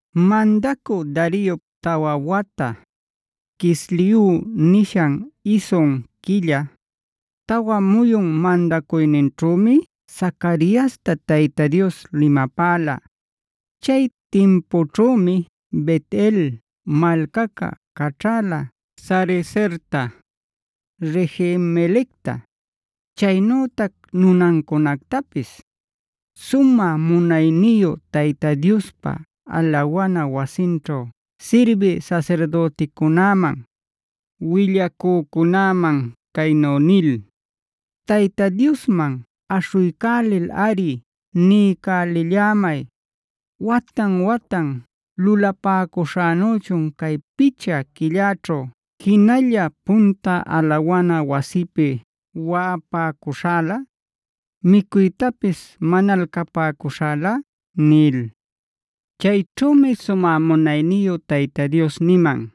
Mandacü Dariop tawa wata, Quisleu nishan isun quilla, tawa muyun mandacuyninćhümi Zacariasta Tayta Dios limapäla. Chay timpućhümi Bet-el malcaca caćhala Sarezerta, Regem-melecta, chaynütac nunancunactapis, sumä munayniyu Tayta Diospa alawana wasinćhu sirbï sasirdüticunäman, willacücunäman caynu nil: “Tayta Diosman aśhuycälilꞌari niycälillämay, ¿watan-watan lulapäcuśhänüchun cay picha quillaćhu, jinalla punta alawana wasipi waꞌapäcuśhälä, micuytapis manalcapäcuśhälä?” Chayćhümi sumä munayniyu Tayta Dios niman: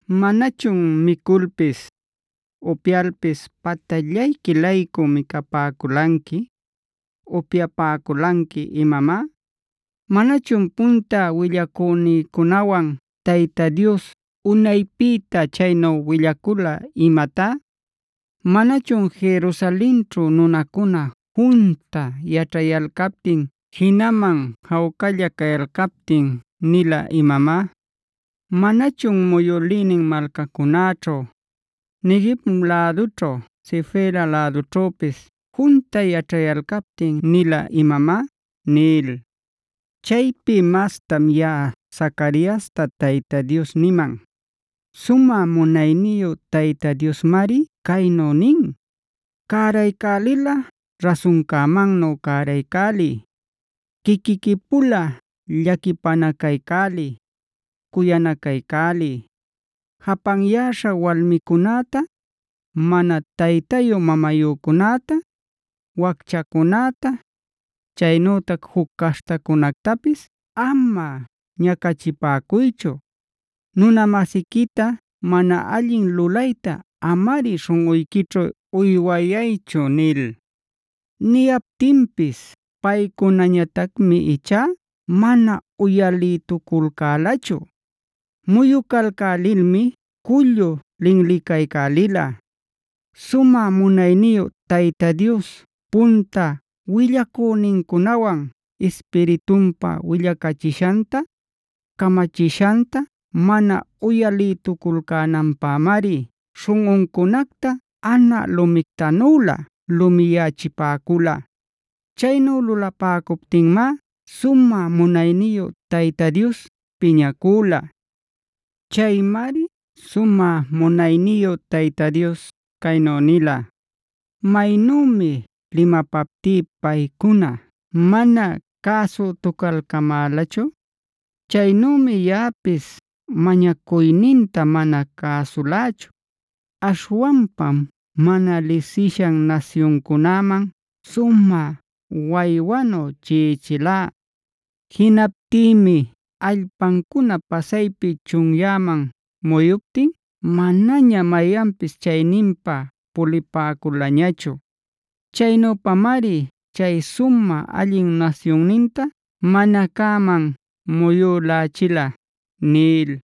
¿Manachun miculpis, upyalpis patallayqui-laycu micapäculanqui, upyapäculanqui imamá? ¿Manachun punta willacünincunawan Tayta Dios unaypïta chaynu willacula imatá? ¿Manachun Jerusalenćhu nunacuna junta yaćhayalcaptin jinaman jawcalla cayalcaptin nila imamá? ¿Manachun muyülïnin malcacunäćhu, Neguev lädućhu, Sefela lädućhüpis junta yaćhayalcaptin nila imamá?’” nil. Chaypi mastam yaꞌa Zacariasta Tayta Dios niman: “Sumä munayniyu Tayta Diosmari caynu nin: ‘Cäraycälilꞌa rasuncämannu cäraycäliy; quiquiqui-pula llaquipänacaycäliy, cuyanacaycäliy. Japanyäśha walmicunäta, mana taytayu-mamayücunäta, wacchacunäta, chaynütac juc caśhtacunätapis ama ñacachipäcuychu. Nuna-masiquita mana allin lulayta amari śhunꞌuyquićhu uywayaychu’ nil. Niyaptinpis paycunañatacmi ichá mana uyalïtuculcälachu. Muyucalcälilmi cullu linlicaycälila. Sumä munayniyu Tayta Dios punta willacünincunawan Ispiritunpa willacachishanta, camachishanta mana uyalïtuculcänanpämari śhunꞌuncunacta anä lumictanülä lumiyachipäcula. Chaynu lulapäcuptinmá sumä munayniyu Tayta Dios piñacüla. Chaymari sumä munayniyu Tayta Dios caynu nila: ‘Maynümi limapaptí paycuna mana cäsütucalcämälachu, chaynümi yaꞌapis mañacuyninta mana cäsulächu. Aśhwanpam mana lisishan nasyuncunäman sumä waywanu chiꞌichilá. Jinaptïmi allpancuna pasaypi chunyäman muyuptin manaña mayanpis chayninpa pulipäculañachu. Chaynüpamari chay sumä allin nasyunninta mana cäman muyülächila’” nil.